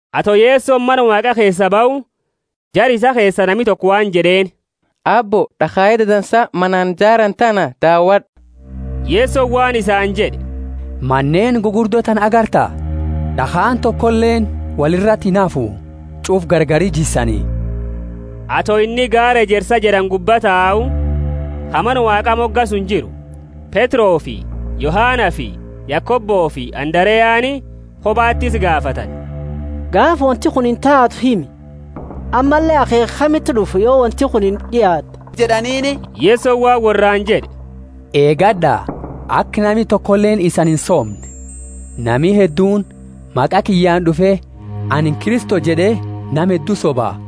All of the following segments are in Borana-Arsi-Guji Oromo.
Ato Yesoni Mana Waaqa keesaa bahu, jara isaa keesa nami toko waan jed'eeni, Aabbo, D'akhaye dadansa manaani jaarani tana dawad'u! Yesoni waan isaani jed'e, Maneeni gugurdo tana agarta? D'akhaani tokoleeni woli irati inhafu; ch'ufa gargari jissani. Ato inni gaara Ejersa jed'ani gubba tau, ka Mana Waaqa moga suni jiru, Petrofi Yohanafi Yakobofi Andareani kobati isa gaafatani. Gaafa wonti kunini taatu nuti himi; ammalle, akheekha kamiti d'ufa, yo wonti kunini d'iaatte? jed'aniini. Yesoni waan worraani jed'e, Eegad'a, aka nami tokoleeni isani insoomne. Nami hedduuni maqa kiyyaani d'ufe, Anini Kristo jed'e nama heddu soba.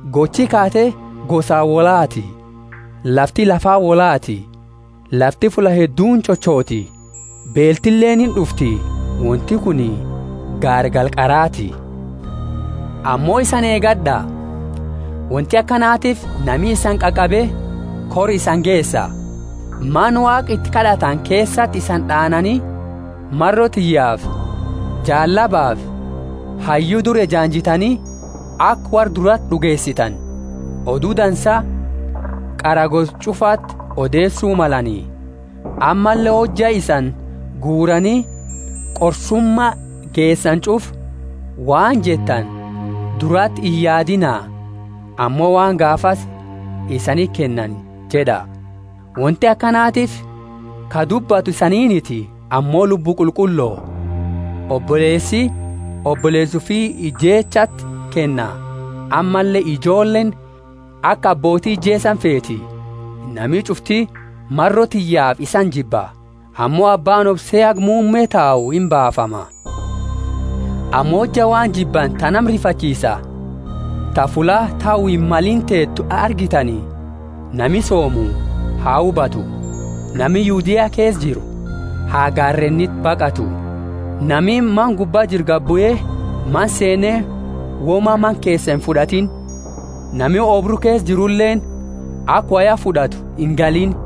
Gochi kaate gosaani wolhaati, lafti lafaani wolhaati; lafti fulla hedduuni chochoti, beeltileeni ind'ufti, wonti kuni gaargala qaraati. Ammo isani eegad'a. Wonti akanatiifi nami isani qaqabe kora isani geesa, Mana Waaqa iti kad'atani keesati isani d'aanani maro tiyyaafi; jaallabafi hayyu dura ejaanjitani, aka worra durati d'ugeesitani. Odu Dansa qara gosa ch'ufaati odeesu malani. Ammalle hojja isani guurani qorsuma geesani ch'ufa, waan jettani durati iyaadiina, ammo waan gaafasi isaniti kennani jed'a. Wonti akanatiifi ka dubbatu isaniiniti, ammo Lubbu Qulqullo. Oboleesi oboleesa ufi ijeechaati kenna, ammalle ijoolleeni aka abbooti ijeesani feeti. Nami ch'ufti maro tiyyaafi isani jibba. Ammo abbaani obse haga muumme tau imbaafama. Ammo hojja waan jibbani ta nama rifachiisa, ta fulla tau himmalini teetu argitani (nami soomu ha hubatu), nami Yudea keesa jiru ha gaareeniti baqatu. Nami mana gubba jiru gadi bue, mana seene woma mana keesaa imfud'atiini. Nami oobru keesa jiruleeni, aka woya fud'atu ingaliini.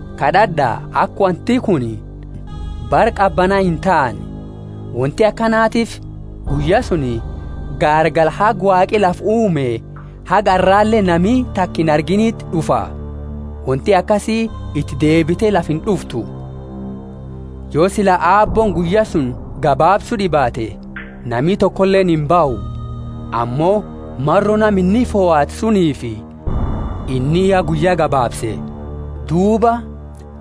Kad'ad'a aka wonti kuni bara qabana intaane. Wonti akanatiifi guyya suni gaargala haga Waaqi lafa uume haga arrale nami taka inargiiniti d'ufa. Wonti akasi iti deebite lafa ind'uftu. Yo sila Aabbooni guyya suni gabaabsu d'ibaate, nami tokoleeni imbahu; ammo maro nama inni fohate suniifi inni ya guyya gabaabse. Duuba,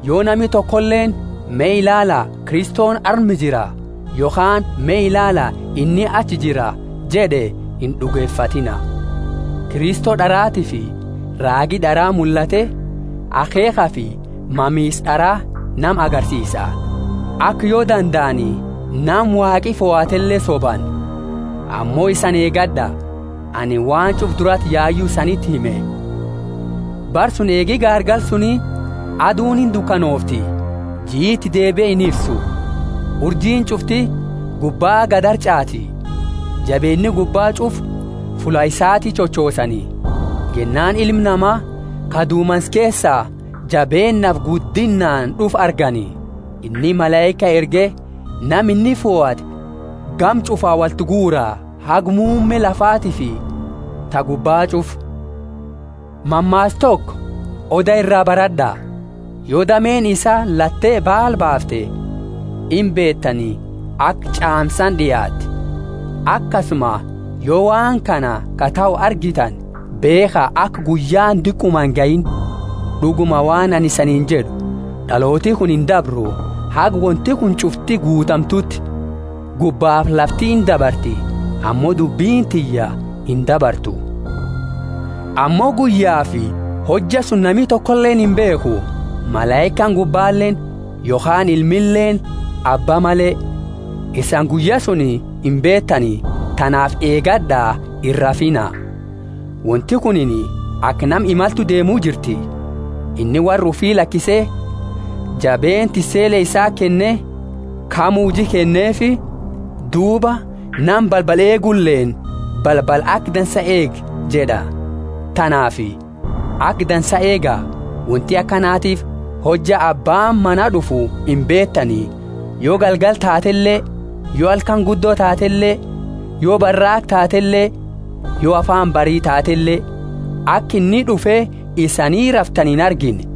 yo nami tokoleeni, Me ilaala, Kristoni arma jira! yokhaani, Me ilaala, inni achi jira! jed'e, ind'ugefatiina. Kristo d'aratiifi raagi d'ara mullate, akheekhafi mamisa d'ara nama agarsiisa, aka yo dandaani, nama Waaqi fohatele sobani. Ammo isani eegad'a, anini waan ch'ufa durati yayu isaniti hime. Bara suni eegi gaargala suni, aduuni indukanoofti, jii iti deebie infisu. Urjiini ch'ufti gubba gadi harch'aati, jabeenna gubba ch'ufa fulla isaati chochoosani. Jennaani Ilma Nama ka dumansa keesa jabeennaafi guddinnaani d'ufu argani. Inni malaika erge nama inni fohate gama ch'ufa wolti guura, haga muumme lafatiifi ta gubba ch'ufa. Mammaasa toko oda iraa barad'a. Yo dameeni isaa latte baala baafte, imbeetani aka ch'aamsaani d'iaate. Akasuma, yo waan kana ka tahu argitani, beekha, aka guyyaani diquma ingahiini. D'uguma, waan anini isaniini jed'u, d'alooti kuni indabru, haga wonti kuni ch'ufti guutamtuuti. Gubbafi lafti indabarti, ammo dubbini tiyya indabartu. Ammo guyyafi hojja suni nami tokoleeni imbeekhu, malaikaani gubbaleeni, yokhaani Ilmileeni, Abba male. Isani guyya suni imbeetani, tanaafi eegad'a, irrafiina. Wonti kunini aka nama imaltu deemu jirti. Inni worra ufi lakise jabeenna tissele isaati kenne, kamu huji kenneefi, duuba nama balbala eeguleeni balbala aka dansa eegi jed'a. Tanaafi aka dansa eega, wonti akanatiifi hojja abbaani mana d'ufu imbeetani, yo galgala taatele, yo halkani guddo taatele, yo baraaqa taatele, yo afaani bari taatele, aka inni d'ufe isani raftani inargine.